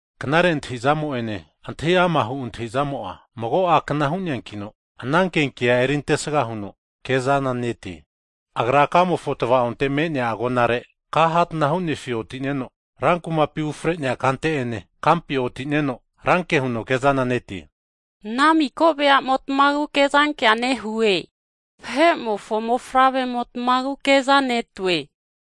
Knare antahintahizamo ene antahi ama'hu antahizamo'a mago a'kna hu'neankino agerura eri antesga huno kezana netie. Agra kamofo tavaonte me'nea agonare, ka hatana hu'nefi otine'no, rankumapi ufre'nea kante ene kampi otineno ranke huno kezana netie. Ana miko vahe'motmagu kezankea nehue. Vahe'motagu kezankea nehue.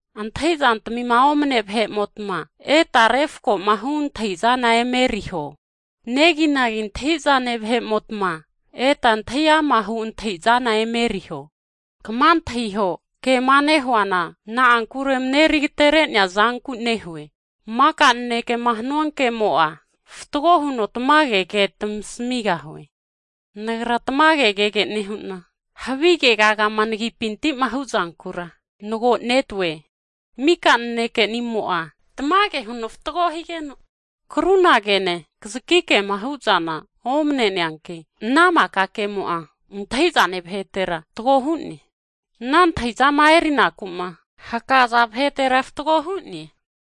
Antahizantmi omane vahe'motma eta refakomahu antahizana emeriho, neginagi antahi'zane vahe'motma, eta antahi amahu antahi'zana emeriho. Kma antahiho kema nehuana, na'ankure mareri agatere'nea zanku nehue, maka nanekema hanua kemo'a, fatgo huno tamage ke tamasamigahue. Nagra tamage kege nehu'na, havi kegagama nagi'pintima huzankura nagonete. Maka nanekenimo'a tamage huno fatgo higeno, krunagene kazaki kema huzana omane'neanki, ana maka kemo'a antahizane vahetera fatgo hu'ne. Ana antahizama erinaku'ma hakaza vahetera, fatgo hu'ne.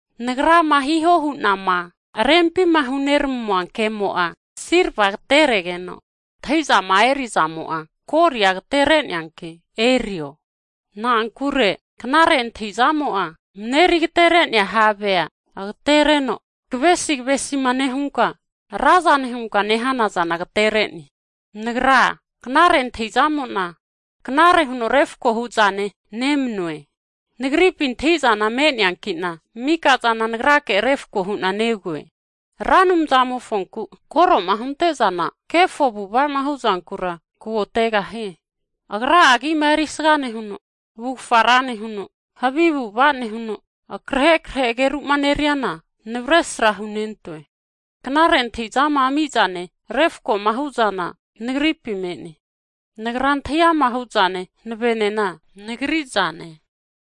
Nagrama hiho hu'nama rempima huneramua kemo'a, silva agateregeno, antahizama erizamo'a, koli'a agatereneanki erio. Na'ankure knare antahi'zamo'a mareri agaterenea havea agatereno, kavesi kavesima nehunka razane hunka nehanazana agatere'ne. Nagra, knare antahi'zamona knare huno refakohu'zane nemanue, Nagripi antahizana me'neankina miko zana nagrake refko hu'na negoe. Ra Anumzamofonku koroma huntezana kefo avu'avama huzankura kagotegahie. Agra'a agima erisga nehuno, avufga ra nehuno, havi avu'ava nehuno, akrahe akrehe ageru'ma aru'zana navesra hunentoe. Knare antahizama ami'zane, refakoma huzana nagripi me'ne. Nagra antahi ama'ma huzane hanavenena nagri zane.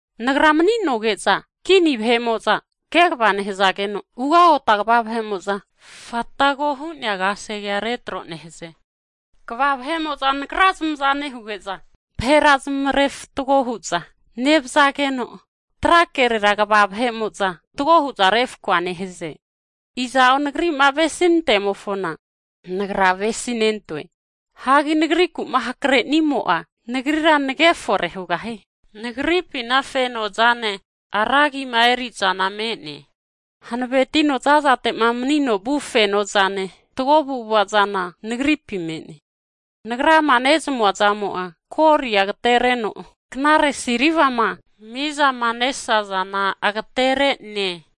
Nagra maninoge'za kini vahe'moza kegva nehazageno, ugota kva vahemoza fatgo hu'nea kasegea retro nehaze. Kva vahe'mo'za nagra zamaza nehuge'za vahera zamavre fatgo huza ne'vzageno, trakere kva vahe'moza fatgo huza refkoa nehaze. Iza'o nagrima avesi nentemofona, nagra avesi nentoe. Hagi nagri'kuma hakre'nimo'a, nagrira nagefore hugahie. Nagripi fenozane, ra agima erizana me'ne. Hanavetino zazatema meno vu fenozane, fatgo avu'avazana nagripi me'ne. Nagrama nezamua zamo'a, golia agatenereno knare silvama mizama nesazazana agaterene.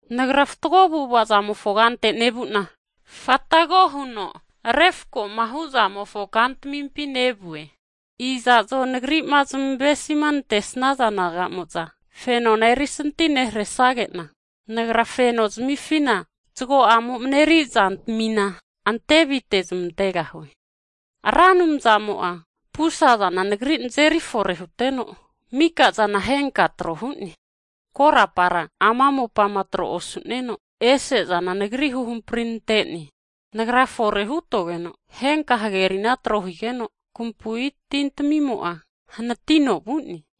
Nagra fatgo avu'avazamofo kante nevuna, fatgo huno refakoma huzamofo kantamimpi nevue. Iza'zo nagrima zmavesi nantesaza nagamo'za, fenona erisanti neharesagena, nagra feno nozamifina zago'amo mareri zantamina antevi tezamantegahue. Ra Anumzamomo'a pusazana nagri nazeri fore huteno, mika'zana henka tro hu'ne. Korapara ama mopama tro osuneno ese zana nagri huhamprinantene. Nagra fore hutogeno henka hagerina tro higeno, kampui tintamimo'a hanatino vu'ne.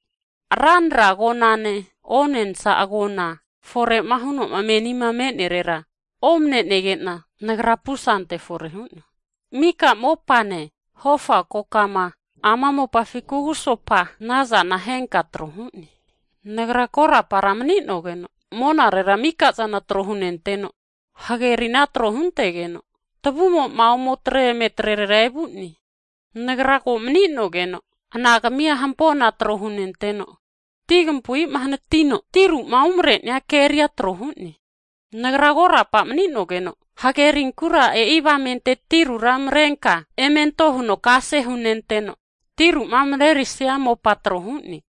Ranra agonane, onensa agona forera huno menima antenerera omanenegena, nagra pusante fore hu'noe. Miko mopane, hofa kokama ama mopafi kugusopa nazana henka tro hu'ne. Nagra korapa maninogeno monarera mikazana tro hunenteno, hagerina tro huntegeno tavumoma ometre emetretera evune. Nagra ko maninogeno anagamua hampona tro hunenteno, tinkampuima hanatino tiruma umarenia keria tro hune. Nagra korapa maninogeno hagerinkura, e'i avamente tirura marenka emetro huno kase hunenteno, tiruma maresia mopa trohune.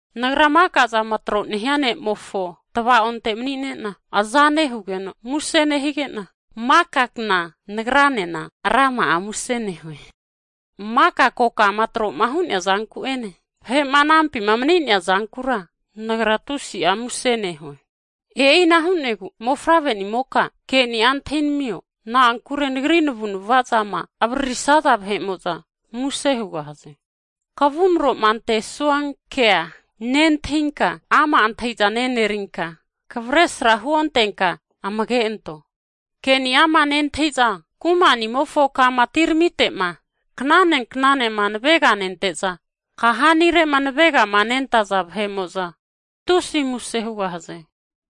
Nagra makazama tro'ma hu'noa Ne'mofo tavaonte mani'nena, aza nehugeno muse nehigena maka kna nagranena rama'a muse nehue. Maka kokama troma hu'nea zanku'ene vahe'ma anampima mani'nea zankura, nagra tusi'a muse nehue. E'ina hu'negu mofavre'nimoka ke'ni'a antahinamio, na'ankure nagri navu'nava zama avaririsaza vahe'mo'za muse hugahaze. Kavumroma antesua kea nentahinka, ama antahizana e'nerinka kavesra huontenka amage anto. Ke'ni'ama nentahiza, kumanimofo kama atiramitema knane knanema naveganenteza, kahani'arema navegama nentaza vahe'mo'za, tusi muse hugahaze.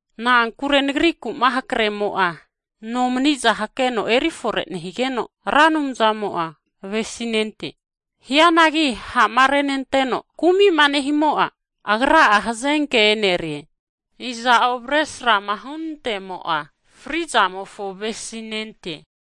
Na'ankure nagriku'ma hakremo'a, nomaniza hakeno erifore nehigeno, Ra Anumzamo'a avesinente. Hianagi ha'marenanteno kumi'ma nehimo'a, agra'a hazenke enerie. Iza'o avesrama hunantemo'a, frizamofo avesinente.